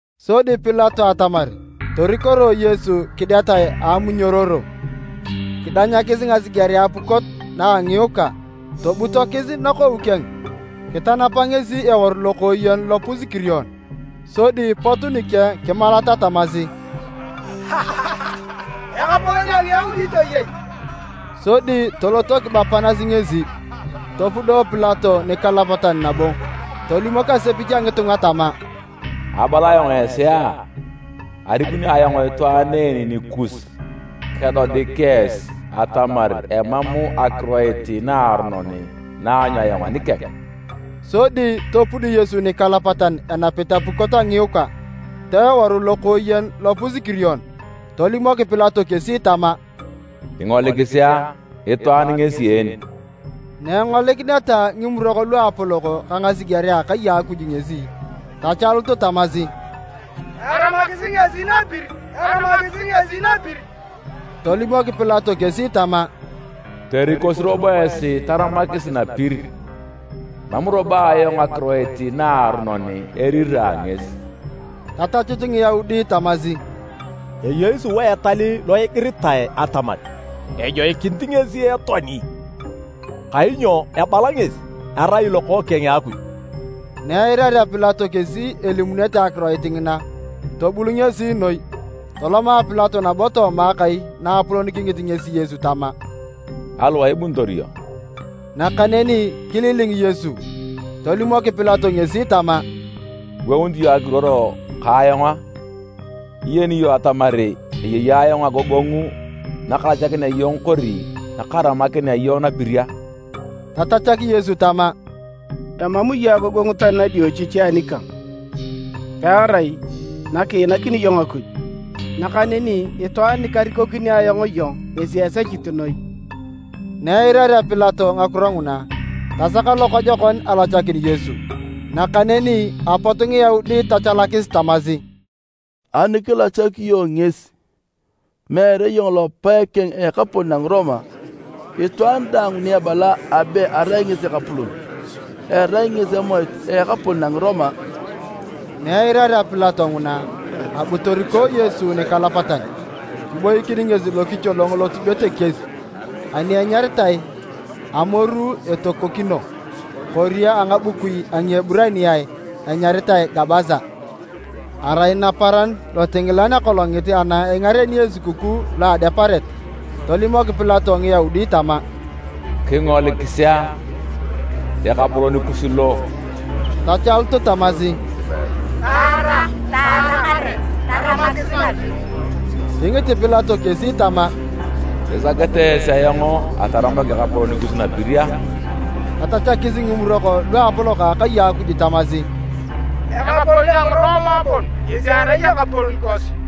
Sodi Pilato atamar torikoroe Yesu kidetae a amunyororo. Kidanyakis ngasigerea apukot na a ngiikwa, tobutokis nakou keng, kitanapa ngesi eworu lokooyen lopus-kirion. Sodi pot nikeng kimalata tamasi, “Ekapolon a Ngiyaudi toyei!” Sodi toloto kibapanasi ngesi. Topudo Pilato nikalapatan nabo tolimok asepich a ngitunga tama, “Abala ayong esi a! Arikuni ayong itwaan en nikus, kedodik esi atamar emam akiroit naaronon na aanyu ayong anikeng.” Sodi topud Yesu nikalapatan enapit apukot a ngiikwa, ta eworu lokooyen lopus-kirion. Tolimok Pilato kesi tama, “Kingolikisi a! Itwaan ngesi en!” Na engolikineta Ngimurok Luapolok ka ngasigerea a akai a Akuj ngesi, tachalut tamasi, “Taramakisi ngesi napir! Taramakisi ngesi napir!” Tolimok Pilato kesi tama, “Torikosi robo esi taramakis napir, emam robo ayong akiroit naaronon erira ngesi.” Tatachut Ngiyaudi tamasi, “Eyei sua etal lo igiritae atamar ejoikinit ngesi etoani kainyo abala ngesi arai Lokookeng a Akuj.” Na eirarea Pilato kesi elimunete akiroit ngina, tobul ngesi noi. Toloma Pilato nabo tooma akai naapolon kingit ngesi Yesu tama, “Aliwae ibunitor iyong?” Nakaneni kililing Yesu. Tolimok Pilato ngesi tama, “Iwounit iyong ekiruor ka ayong a? Nyiyeni iyong atamar eyei ayong agogongu nakalachakinea iyong kori nakaramakinea iyong napir a?” Tatachak Yesu tama, “Emam iyong agogongu tani nadiochichi anikang, pearai nakiinakini iyong Akuj, nakaneni itwaan nikarikokini ayong iyong ngesi esechit noi.” Na eirarea Pilato ngakiro nguna, tasak lokojokon alachakin Yesu, nakaneni apot Ngiyaudi tachalakis tamasi, “Ani kilachak iyong ngesi, meere iyong lopae keng a ekapolon a Ngiroma! Itwaan daang ni ebala abe arai ngesi ekapolon, erai ngesi emoit a ekapolon a Ngiroma!” Na eirarea Pilato nguna, abu toriko Yesu nikalapatan, kiboikin ngesi lokicholong lotubet ekies ani enyaritae “Amoru etokokino,” (kori a ngabukui a Ngieburaniae anyaritae “Gabasa.”) Arai naparan lotingilan a akolongit ana ingareni esukukuu lo a Adeparet. Tolimok Pilato Ngiyaudi tama, “Kingolikis a! Ekapolon kus lo!” Tachalut tamasi, “Taara! Taara kare! Taramakisi napir!” Kingit Pilato kesi tama, “Isakete esi ayong ataramak ekapolon kus napir a?” Tatachakis Ngimurok Luapolok a akai a Akuj tamasi, “Ekapolon a Ngiroma bon ngesi erai ekapolon kosi!”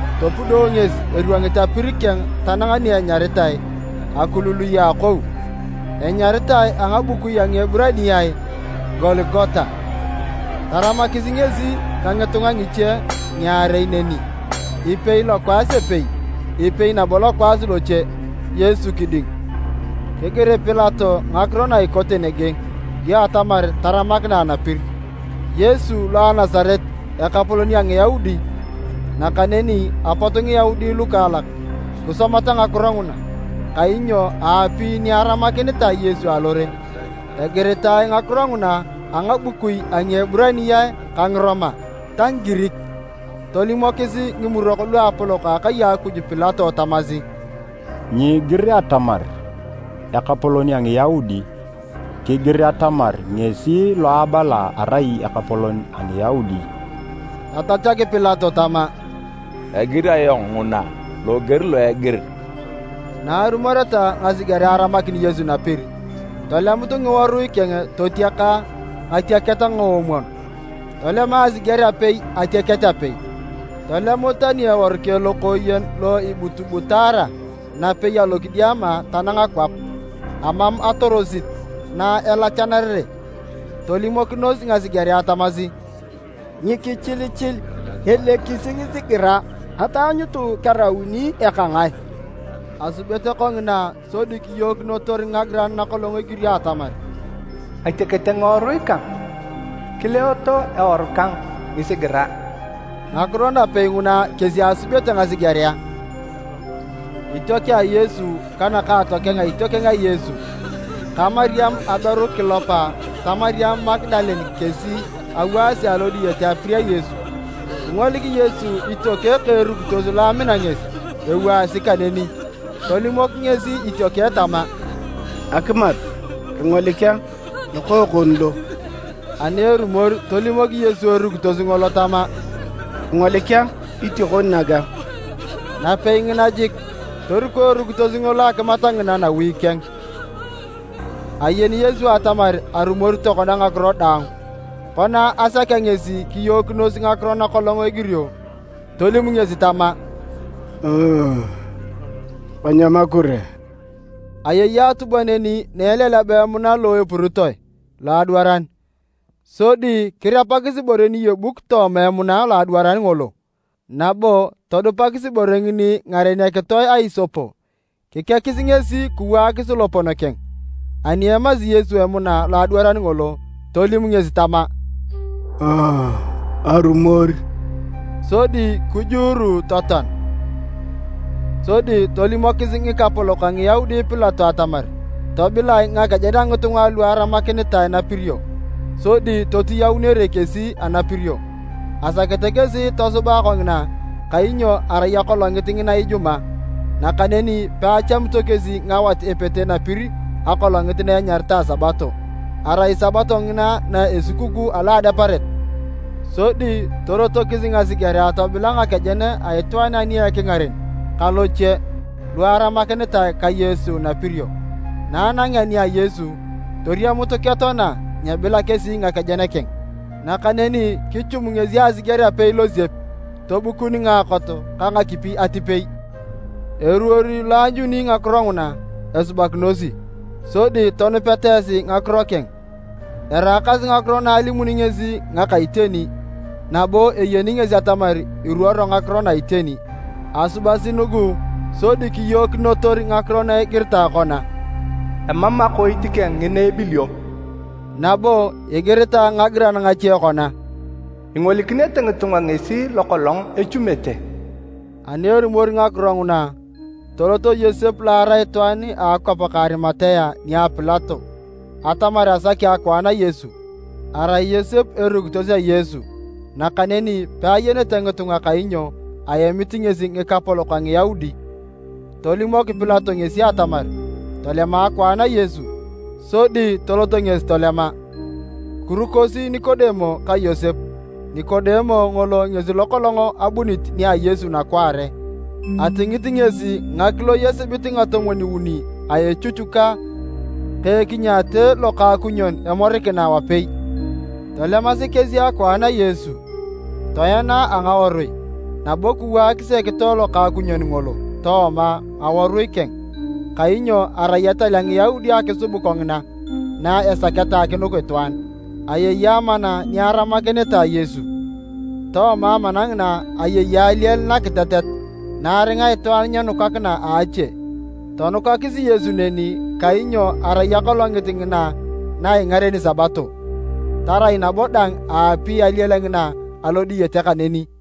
Topudo ngesi eriongit apir keng tanang ni enyaritae, “Akulului a Akou.” (Enyaritae a ngabukui a Ngieburaniae “Gologota.”) Taramakis ngesi ka ngitunga ngiche ngiarei neni, ipei lokwaas epei, ipei nabo lokwaas loche, Yesu kiding. Kigir Pilato ngakiro na ikote nege dio atamar taramakinae napir, “Yesu lo a Nasaret, ekapolon a Ngiyaudi.” Nakaneni apot Ngiyaudi lukaalak kisomata ngakiro nguna, kainyo aapi ni aramakinitae Yesu alore. Egiritae ngakiro nguna a ngabukui a Ngieburaniae ka Ngiroma ta Ngigirik. Tolimokis Ngimurok Luapolok a akai a Akuj Pilato tamasi, “Nyiigir atamar, ‘Ekapolon a Ngiyaudi, kigir atamar ngesi lo abala arai ekapolon a Ngiyaudi.’” Tatachak Pilato tama, “Egir ayong nguna loger lo egir.” Na arumoreta ngasigerea aramakin Yesu napir, tolemut ngiworui keng totiaka ngatiaket ngoomwon, tolema asiger apei atiaket apei. Tolemut tani eworu keng lokooyen lo ebutubutaara napei alokidiama tanang kwap, amam atorosit na elachanarere. Tolimokinos ngasigerea tamasi, “Nyikichilichil, elekisi ngisigira ataanyutu kerauni eka ngae.” Asubete kongina sodi kiyookinotor ngagiran nakolong egirio atamar, “Atiakete ngiworui kang, kileeto eworu kang ngisigira.” Ngakiro napei nguna kesi asubete ngasigerea. Itiokeng a Yesu ka nakaatokeng a itiokeng a Yesu, ka Mariam aberu a Kilopa ta Mariam Magadalene kesi awaasi alo diyete apir a Yesu. Kingolik Yesu itiokeng ka erukitos lo amina ngesi ewaasi kaneni. Tolimok ngesi itiokeng tama, “Akimat, kingolik a, lokookon lo.” Ani erumor, tolimok Yesu erukitos ngolo tama, “Kingolik a, itiokon naga.” Napei ngina jik, toriko erukitos ngolo akimat ngina nawi keng. Ayeni Yesu atamar arumor tokona ngakiro daang. Kona asakea ngesi kiyookinos ngakiro nakolong egirio, tolim ngesi tama, “Kanyam akure.” Ayei atubwa neni na eleleba emuna lo epuritoe loadwaran, sodi kirepakis ibore niyebuk tooma emuna loadwaran ngolo, nabo todupakis ibore ngini ngaren akitoe a isopo,g kikekis ngesi kiwaakis lopon keng. Ani emasi Yesu emuna loadwaran ngolo, tolim ngesi tama, “Arumor.” Sodi kijuuru totoan. Sodi tolimokis ngikapolok a Ngiyaudi Pilato atamar tobilae ngakejen a ngitunga alu aramakinitae napirio sodi totiyaunere kesi anapirio. Asakete kesi tosubae kongina kainyo arai akolongit ngina Ijumaa, nakaneni peachamito kesi ngawat epete napirio akolongit na enyaritae Sabato. Arai sabato ngina na Esukukuu alo a Adeparet. Sodi torotokis ngasigerea tobila ngakejen a itwaan ani a ekingaren ka loche, lu aramakinitae ka Yesu napirio. Na anangeta nia Yesu, toriamut ketoana, nyebila kesi ngakejen keng. Nakaneni kichum ngesi asiger apei losiep, tobukun ngaakot ka ngakipi atipei. ( Eruor lo aanyuni ngakiro nguna esubakinosi, sodi tonupeta esi ngakiro keng. Eraakasi ngakiro na alimuni ngesi ngaka iteni, nabo eyeni ngesi atamar iruoro ngakiro na iteni.) Asubasi nugu sodi kiyookinotor ngakiro na igiritae kona, “Emam akoit keng ngina ebilio.” Nabo igiritae ngagiran ngache kona, “Ingolikinete ngitunga ngesi lokolong echumete.” Ani erumor ngakiro nguna, tolot Yosep lo arai itwaan a akwap ka Arimatea nia Pilato atamar asaki akwaan a Yesu. (Arai Yosep a Yesu nakaneni peayenete ngitunga kainyo aemit ngesi ngikapolok a Ngiyaudi.) Tolimok Pilato ngesi atamar tolema akwaan a Yesu, sodi tolot ngesi tolema. Kirukosi Nikodemo ka Yosep, Nikodemo ngolo ngesi lokolong abunit nia Yesu nakwaare. Atingit ngesi ngakiloi esibit ngatomwon-uni a echuchuka ka ekinyaate lokaakunyon emorikina wapei. Tolemasi kesi akwaan a Yesu, toena a ngawarui, nabo kiwaakis ekitoe lokakukunyon ngolo tooma ngawarui keng, kainyo arai etal a Ngiyaudi akisub kongina na esaketa akinuk itwaan. Ayei amana ni aramakinitae Yesu. Tooma amana ngina ayei aliel nakitetet na aringa itwaan nyenukakina a ache. Tonukakis Yesu neni kainyo arai akolongit ngina na ingareni Sabato, tarai nabo dang aapi aliel ngina alo diyete kaneni.